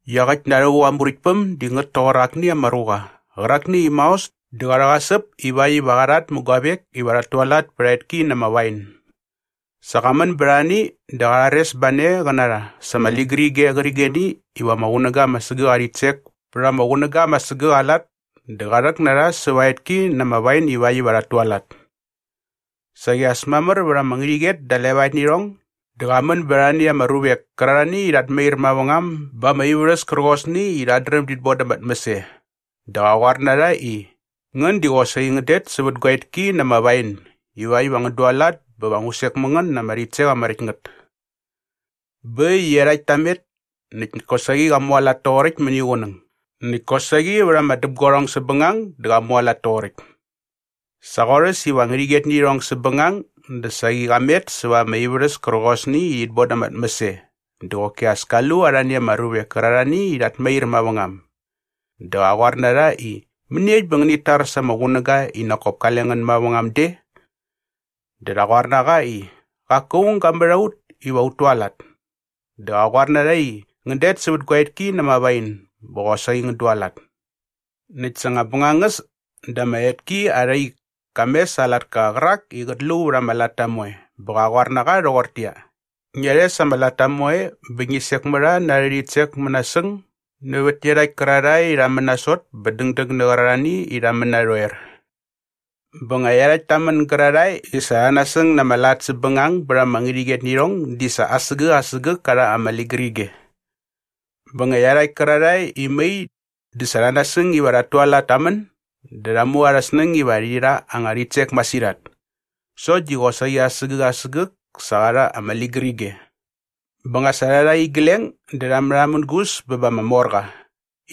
“Iaqäkt na rhävuk aa Muräktpäm di ngät toqor akni ama ruqa qärakni i maos dä qa rhäqasäp ivakt iva qa rhat mä guavek iva rhat tualat pät aa etki na ama wain. Sa qa män bät arhani dä rha rhares ba ne qä na rha sa ama ligärige qärqigeni i ama qunäga ama sägäk aa rhitsek pät ama qunäga ama sägäk aa lat dä qa rhäk na rha säva aa etki na ama wain ivakt iva rhat tualat. “Saqi as mamär vät ama ngärhäqyet da levaet nä irhong dä qa män bät arhani ama ruvek kärarhani i rhat mair mavängam ba ama ivärhäs kärqosni i rhat dräm dit boda ama tmäs e dä qa qoar na rha i, ‘Ngän di qosaqi ngän det sävät gua etki na ama wain ivakt iva ngän dualat bä va ngu sek mä ngän na ama rhitsek ama räkt ngät.’ “Bä äkt i iarhakt ta met näkt kosaqi qa mualat toqoräkt mäniqunäng näkt kosaqi vät ama däpguarhong säpbängang dä qa mualat toqoräkt. Sa qorhäs iva ngärhäqyet nä irhong säpbängang dä saqi qa met säva ama ivärhäs kärqosni i rhit boda ama tmäs e dä qoki as ka lu arhani ama ruvek kärarhani i rhat mair mavängam. Dä qa qoar na rha i, ‘Mäniekt bä ngänit tar sa ama qunäga i nak kop kale ngän mavängam de?’ “Dä rha qoar na qa i, ‘Qaku aung ga mät a ut iva ut tualat.’ Dä qa qoar na rha i, ‘Ngän det sävät gua etki na ama wain bä qosaqi ngän dualat.’ “Näkt sa nga bängangäs dä ama etki arha ik ka mes aa latka qärak i qät lu vät ama latta moe bä qa qoar na qa rhoqortäqyia, ‘Ngia rhes ama latta moe bä ngi sek mä rha na arhä rhitsek mänasäng nävät iarhakt kärarhae i rha män nasot bä dängdäng nä qärarhani i rha män narhoer.’ Bä nga iarhakt ta män gärarhae i sa rha nasäng na ama lat säpbängang bät ama ngärhäqyet nä irhong di sa asägäk asägäk ka rha ama ligärige. “Bä nga iarhakt kärarhae i mai dä sa rha nasäng iva rhat tualat ta män dä rha mu arhä snäng iva rhi rha anga rhitsek masirhat. Sokt di qosaqi asägäk asägäk sa qa rha ama ligärige. Bä nga sa rha rha igleng dä rha märhamängus bä ba ama morqa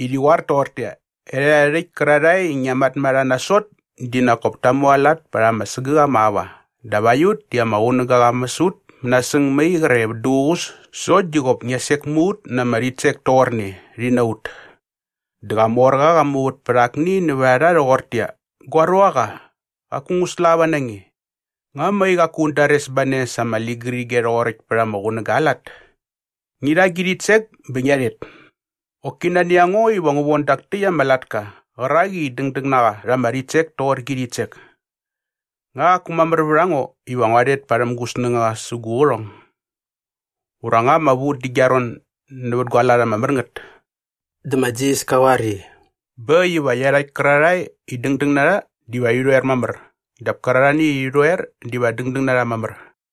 i rhi qoar toqortäqyia, ‘Erhärhae rhäkt kärarhae i ngia mät a rha nasot di nak kop ta mualat pät ama sägäk ama aua dap aiut di ama qunäga qa mäs ut mänasäng mai qre vät duququs sokt di qop ngia sek mä ut na ama rhitsek toqorne, rhi na ut!’ “Dä qa morqa qa muvät pät akni nävät a rha rhoqortäqyia, ‘Gua ruaqa, qaku ngu slava na nge. Nga mai qaku un dares ba ne sa ama ligärige rhoqoräkt pät ama qunäga aa lat?’ Ngi rha gi rhitsek bä ngia rhet. Qoki nani a ngo iva ngu von dak täkt ama latka qärak i dängdäng na qa rha ama rhitsek toqor gi rhitsek. Nga qaku mamär vät a ngo iva ngua rhet parhäm gu snängaqa sä gu qärhong? Ura nga ama vu dä gia ron nävät gua lat ama mär ngät?” Dä ma Jisas ka qoar i, “Bä äkt iva iarhakt kärarhae i dängdäng na rha diva rhi rhoer mamär dap kärarhani i rhi rhoer diva dängdäng na rha mamär.”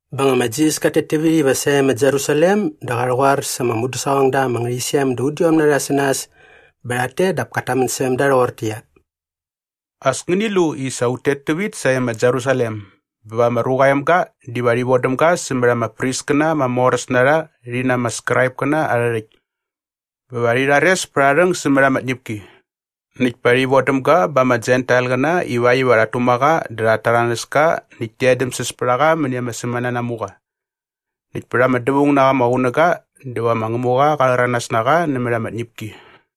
Bä nga ma Jisas kat tet tävit iva sae ma Jerusalem dä qa rhäqoar sa ama mudäsaqongda ama ngärhäqyisem da udiom na rha sä nas bä rhat tet dap kat tamän särhäm da rhoqortäqyia, “As ngäni lu i sa ut tet tävit sae ma Jerusalem bä va ma Ruqa aa Emga diva rhi vodäm ga sämät ama priskäna ama moräs na rha rhi na ama Skraipkäna arhä rhäkt. Bä va rhi rhares pät aa rhäng sämät ama tñäpki. Näkt pa rhi vodäm ga ba ama Jentailqäna ivakt iva rhat tuma qa dä rhat täranäs ka näkt ti edämsäs pät a qa mäni ama sämänanamuqa. Näkt pät ama dävaung na qa ama qunäga dä va ma Ngämuqa qa rhäranas na qa nämät ama tñäpki.”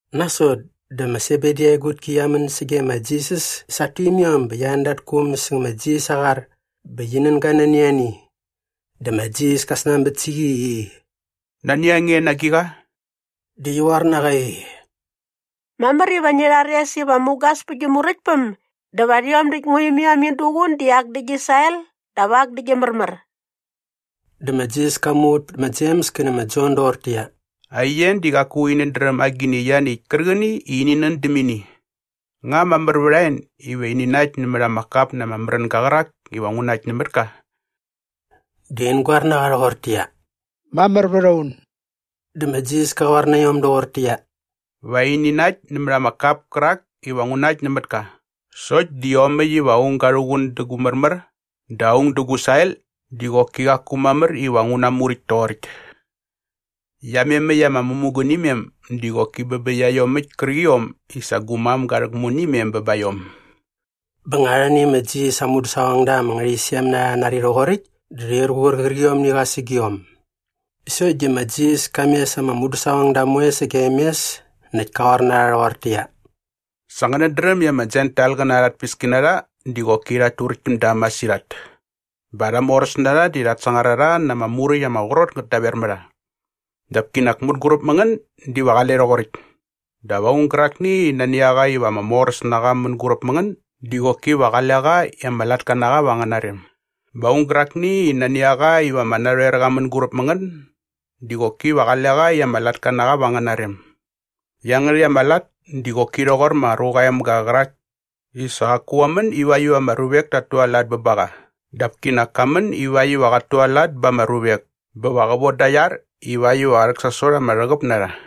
Nasot dä ma Sebedi aa egutki qia män sage ma Jisas sa at tuimiom bä qia an da at kuum säng ma Jisas aa qar bä qi nän ga nani ani. Dä ma Jisas ka snanbät sä qi i, “Nani a nge na agiqa?” Dä qi qoar na qa i, “Mamär iva ngi rhares iva mugas pä gi Muräktpäm dä va rhiom däkt ngua imiom in duqun di ak dä gi sael dap ak dä gi märmär.” Dä ma Jisas ka muvät pät ma Jems kä nä ma Jon doqortäqyia, “Aien di qaku inät dräm agini ianiäkt kärqäni i ini nän däm ini. Nga mamär vät a en iva ini nakt nämät ama kap na ama märänga qärak iva ngu nakt nämät ka?” Dä in goar na qa rhoqortäqyia, “Mamär vät a un.” Dä ma Jisas ka qoar na iom doqortäqyia, “Va ini nakt nämät ama kap kärak iva ngu nakt nämät ka sokt di iomäkt iva aung ga rhuqun dä gu märmär dä aung dä gu sael di qoki qaku mamär iva ngu namuräkt toqoräkt. Iamemäkt ama mämugunimem di qoki bä bä iaiomäkt kärqiom i sa gu mam ga rhäkmu nä imem bä ba iom.” Bä nga arhani ma Jisas aa mudäsaqongda ama ngärhäqyisem na rha rha nari rhoqoräkt dä rhir qur qärqiomni qa sägiom. Sokt di ma Jisas ka mes ama mudäsaqongda moe sagem mes näkt ka qoar na rha rhoqortäqyia, “Sa ngänät dräm i ama Jentailqäna arha tpäskinarha di qoki rhat turäkt täm da masirhat bä arha moräsnarha di rhat sangar a rha na ama muräkt ama qrot ngät daver mä rha. Dap kinak mänguräp mä ngän diva qale rhoqoräkt. Dap aung gärakni i nani a qa iva ama moräs na qa mänguräp mä ngän di qoki va qale qa i ama latka na qa va angäna rem bä aung gärakni i nani a qa iva ama narhoer qa mänguräp mä ngän di qoki va qale qa i ama latka na qa va angäna rem. Iangärhäkt ama lat di qoki rhoqor ma Ruqa aa Emga qärak i sa qaku qa män ivakt iva ama ruvek tat tualat bä ba qa dap kinak ka män ivakt iva qat tualat ba ama ruvek bä va qä voda aa iar ivakt iva qä rhäksasot ama rhäqäp na rha.”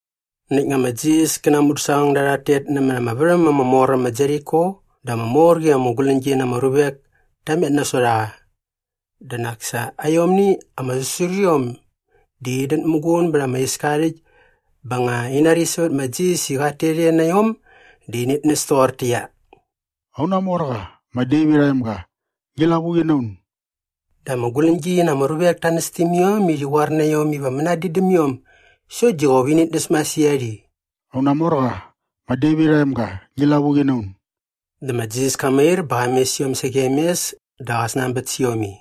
Näkt nga ma Jisas kä na aa mudäsaqongda rhat tet nämät ama värhäm ama mor äm ma Jeriko dä ama mor qi ama guläñgi na ama ruvek ta met nasot a qa. Dä nak sa aiomni ama säsuriom di inät muqun bät ama iska aa rhäkt bä nga in nari sävät ma Jisas i qat tet e na iom dä init näs toqortäqyia, “Auna morqa, ma Devit aa emga, ngi lavuqi na un!” Dä ama guläñgi na ama ruvek ta näs täm iom i rhi qoar na iom iva mänadin däm iom sokt di qop init näs masirhat i, “Auna morqa, ma Devit aa emga, ngi lavuqi na un!” Dä ma Jisas ka mair bä qa mes iom sagem mes dä qa snanbät sä iom i,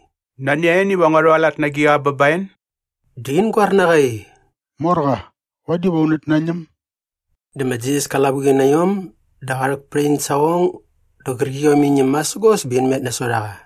“Nani a en iva ngua rhualat na agiqa bä ba en?” Dä in goar na qa i, “Morqa, vadi va unät nañäm.” Dä ma Jisas ka lavuqi na iom dä qa rhäk pät in saqong dä qärqiom in ñäm masägos bä in met nasot a qa.